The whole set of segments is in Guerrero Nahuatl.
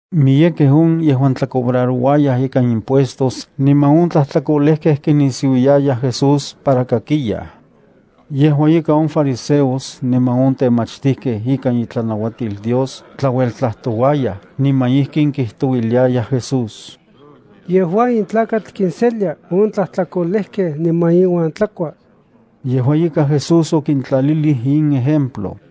Miyekej on yejuan tlacobrarouayaj ika impuestos niman on tlajtlakolejkej kinisiuiayaj Jesús para kakiyaj. Yejua ika on fariseos niman on temachtijkej ikan itlanauatil Dios tlaueltlajtouayaj niman ijkin kijtouiliayaj Jesús: —Yejua in tlakatl kinselia on tlajtlakolejkej niman inuan tlakua. Yejua ika Jesús okintlalilij in ejemplo: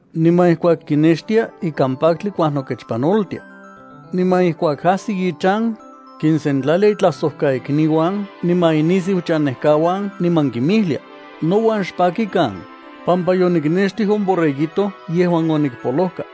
Niman ijkuak kinextia, ikan paktli kuajnokechpanoltia. Niman ijkuak ajsi ichan, kinsentlalia itlajsojkaikniuan niman inisiuchanejkauan niman kinmijlia: “Nouan xpakikan, pampa yoniknextij on borreguito yejuan onikpolojka.”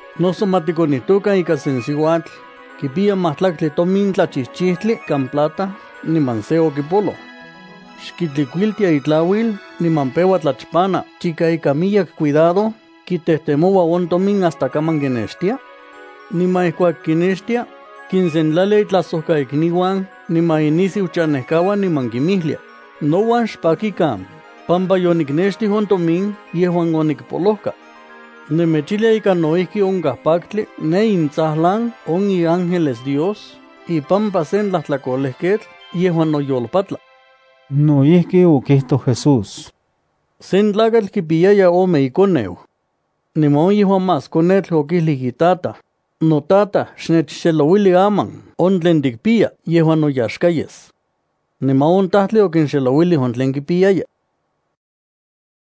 ’Noso ma tikonijtokan ika sen siuatl kipiya majtlaktli tomin tlachijchijtli ikan plata niman se okipoloj. ¿Xkitlikuiltia itlauil niman peua tlachpana chika ikan miyek cuidado kitejtemoua on tomin hasta kaman kinextia? Niman ijkuak kinextia, kinsentlalia itlajsojkaikniuan niman inisiuchanejkauan niman kinmijlia: “Nouan xpakikan pampa yoniknextij on tomin yejuan onikpolojka.” Nemechijlia ika no ijki onkaj paktli ne intsajlan on iángeles Dios ipampa se tlajtlakolejketl yejuan noyolpatla. No ijki okijtoj Jesús: —Sen tlakatl kipiyaya ome ikoneu. Niman on yejuan más konetl okijlij itataj: “Notataj, xnechxelouili aman on tlen tikpiya yejuan noyaxka yes.” Niman on tajtli okinxelouilij on tlen kipiyaya.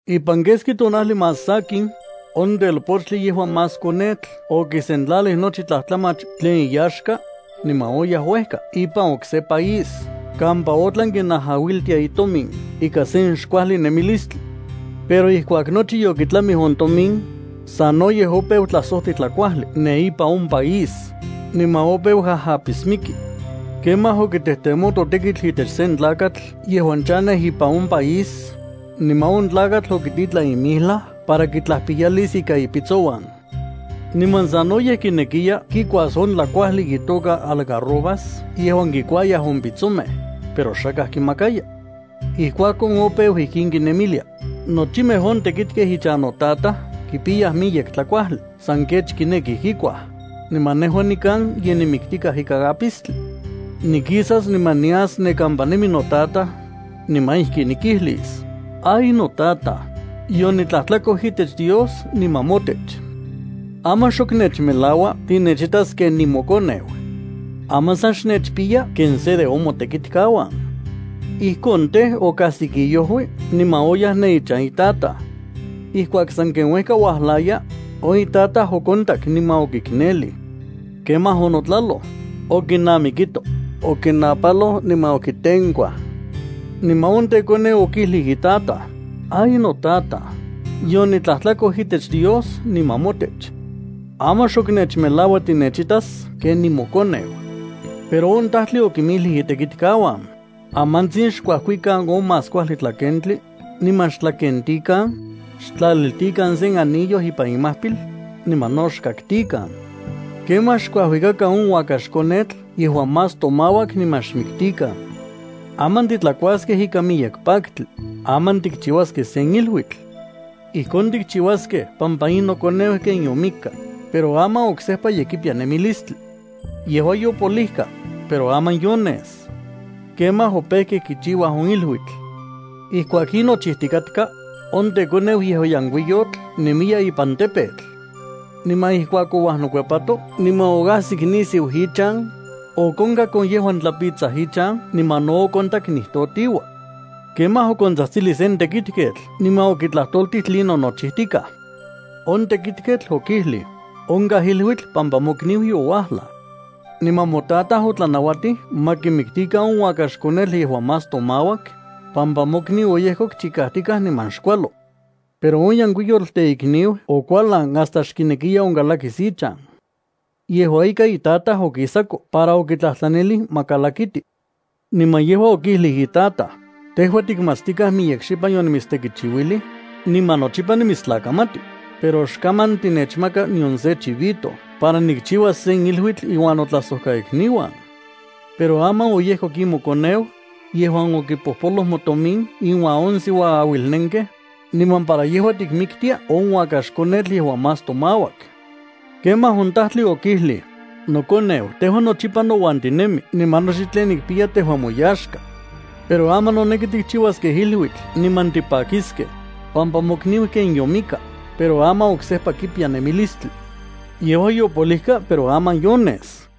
Ipan keski tonajli más sakin, on telpochtli yejuan más konetl okisentlalij nochi tlajtlamach tlen iyaxka, niman oyaj uejka ipan okse país kampa otlan kinajauiltia itomin ikan sen xkuajli nemilistli. Pero ijkuak nochi yokitlamij on tomin, sanoyej opeu tlasojti tlakuajli ne ipan on país, niman opeu ajapismiki. Kemaj okitejtemoto tekitl itech sen tlakatl yejuan chanej ipan on país, niman on tlakatl okititlan ipan icampo para kitlajpiyalis ika ipitsouan. Niman sanoyej kinekiya kikuas on tlakuajli itoka algarrobas yejuan kikuayaj on pitsomej, pero xakaj kimakaya. Ijkuakon opeu ijkin kinemilia: “Nochimej on tekitkej ichan notataj kipiyaj miyek tlakuajli san kech kinekij kikuaj, niman nejua nikan ye nimiktikaj ikan apistli. Nikisas, niman nias ne kampa nemi notataj, niman ijkin nikijlis: Ay notaj, yonitlajtlakoj itech Dios niman motech. Aman xok nechmelaua tinechitas ken nimokoneu. Aman sa xnechpiya ken se de on motekitkauan.” Ijkon tej, okajsik iojui niman oyaj ne ichan itataj. ’Ijkuak sanken uejka uajlaya, on itataj okontak niman okiknelij. Kemaj onotlaloj, okinamikito, okinapaloj niman okitenkuaj. Niman on tekoneu okijlij itataj: “Ay notataj, yonitlajtlakoj itech Dios niman motech. Aman xok nechmelaua tinechitas ken nimokoneu.” Pero on tajtli okinmijlij itekikauan: ¡Amantsin xkuakikan on más kuajli tlakentli, niman xtlakentikan! Xtlaliltikan sen anillo ipan imajpil, niman no xkaktikan. Kemaj xkuajuikakan on uakaxkonetl yejuan más tomauak niman xmiktikan. ¡Aman titlakuaskej ikan miyek paktli! ¡Aman tikchiuaskej sen iluitl! Ijkon tikchiuaskej, pampa in nokoneu ken yomikka, pero aman oksejpa ye kipiya nemilistli. Yejua yopolijka, pero aman yones. Kemaj opejkej kichiuaj on iluitl. ’Ijkuak in nochijtikatka, on tekoneu yejuan yenkuiyotl nemiya neka ipan campo. Niman ijkuak ouajnokuepato niman oajsik nisiu ichan, okonkak on yejuan tlapitsaj ichan niman no okontak nijtotiua. Kemaj okontsajtsilij sen tekitketl niman okitlajtoltij tlinon nochijtikaj. On tekitketl okijlij: “Onkaj iluitl pampa mokniu youajlaj. Niman motataj otlanauatij ma kimiktikan on uakaxkonetl yejuan más tomauak, pampa mokniu oyejkok chikajtikaj niman xkualo.” Pero on yenkuiyotl teikniu okualan hasta xkinekiya onkalakis ichan. Yejua ika, itataj okisako para okitlajtlanilij ma kalakiti. Niman yejua okijlij itataj: “Tejua tikmatstikaj miyek xipan yonimitstekichiuilij, niman nochipa nimitstlakamati, pero xkaman tinechmaka nion sen chivito para nikchiuas sen iluitl inuan notlajsojkaikniuan. Pero aman oyejkok in mokoneu, yejuan okipojpoloj motomin inuan on siuaauilnenkej, niman para yejua tikmiktia on uakax konetl yejuan más tomauak.” Kemaj on tajtli okijlij: “Nokoneu, tejua nochipa nouan tinemi niman nochi tlen nikpiya tejua moyaxka. Pero aman noneki tikchiuaskej iluitl niman tipakiskej, pampa mokniu ken yomikka, pero aman oksejpa kipiya nemilistli. Yejua yopolijka, pero aman yones.”